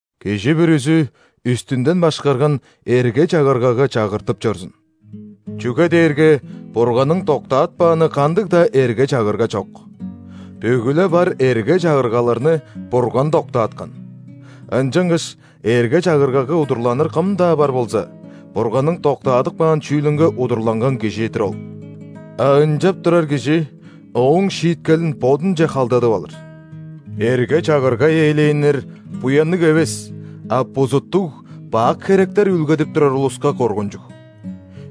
Кижи бүрүзү үстүнден башкарган эрге-чагыргага чагыртып чорзун, чүге дээрге Бурганның доктаатпааны кандыг-даа эрге-чагырга чок. Бүгү-ле бар эрге-чагыргаларны Бурган доктааткан. Ынчангаш эрге-чагыргага удурланыр кым-даа бар болза, Бурганның доктаадып каан чүүлүнге удурланган кижи-дир ол. А ынчап турар кижи Ооң шииткелин бодунче халдадып алыр. Эрге-чагырга ээлээннер буянныг эвес, а бузуттуг-бак херектер үүлгедип турар улуска коргунчуг.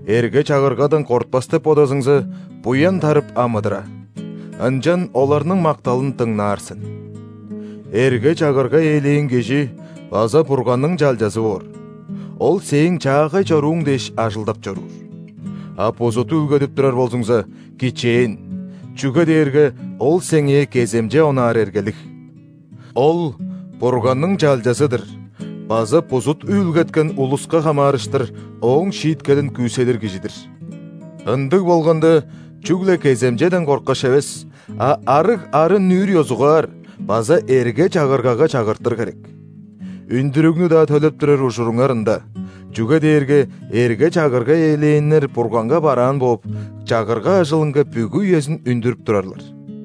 Эрге-чагыргадан кортпас деп бодазыңза, буян тарып амыдыра, ынчан оларның макталын дыңнаар сен. Эрге-чагырга ээлээн кижи база Бурганның чалчазы боор, ол сээң чаагай чорууң дээш ажылдап чоруур. А бузут үүлгедип турар болзуңза, кичээн, чүге дээрге ол сеңээ кеземче онаар эргелиг. Ол – Бурганның чалчазы-дыр база бузут үүлгеткен улуска хамаарыштыр Ооң шииткелин күүседир кижи-дир. Ындыг болганда, чүгле кеземчеден корткаш эвес, а арыг арын-нүүр ёзугаар база эрге-чагыргага чагыртыр херек. Үндүрүгнү-даа төлеп турар ужуруңар ында, чүге дээрге эрге-чагырга ээлээннер Бурганга бараан бооп, чагырга ажылынга бүгү үезин үндүрүп турарлар.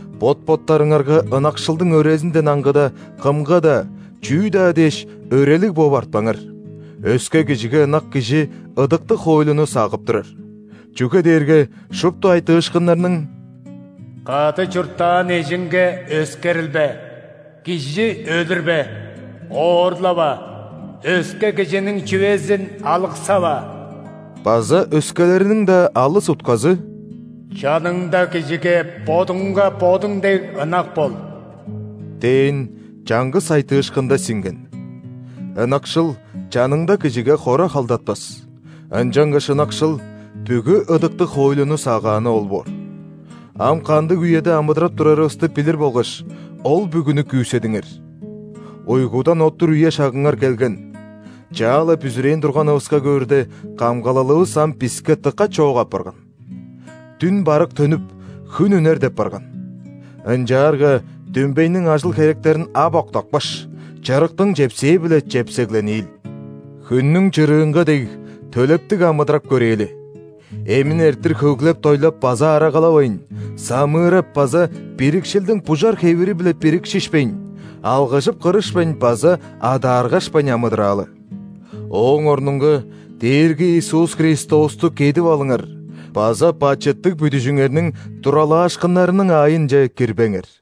Бот-боттарыңарга ынакшылдың өрезинден аңгыда, кымга-даа, чүү-даа дээш, өрелиг бооп артпаңар; өске кижиге ынак кижи ыдыктыг хоойлуну сагып турар. Чүге дээрге шупту айтыышкыннарның: «Кады чурттаан эжиңге өскерилбе», «Кижи өлүрбе», «Оорлава», «Өске кижиниң чүвезин алыксава» база өскелериниң-даа алыс утказы «Чаныңда кижиге бодуңга бодуң дег ынак бол» дээн чаңгыс айтыышкында сиңген. Ынакшыл чаныңда кижиге хора халдатпас. Ынчангаш ынакшыл – бүгү ыдыктыг хоойлуну сагааны ол боор. Ам кандыг үеде амыдырап турарывысты билир болгаш, ол бүгүнү күүседиңер. Уйгудан оттур үе-шагыңар келген, чаа-ла бүзүрээн турганывыска көөрде, камгалалывыс ам биске дыка чоок апарган. Дүн барык төнүп, хүн үнер деп барган. Ынчаарга дүмбейниң ажыл-херектерин ап октапкаш, чырыктың чепсээ-биле чепсеглениил. Хүннүң чырыынга дег, төлептиг амыдырап көрээли: эмин эрттир хөглеп-дойлап база арагалавайн, самыырап база бирикшилдиң бужар хевири-биле бирикшишпейн, алгыжып-кырышпайн база адааргашпайн амыдыраалы. Ооң орнунга Дээрги Иисус Христосту «кедип алыңар» база бачыттыг бүдүжүңерниң туралаашкыннарының аайынче кирбеңер.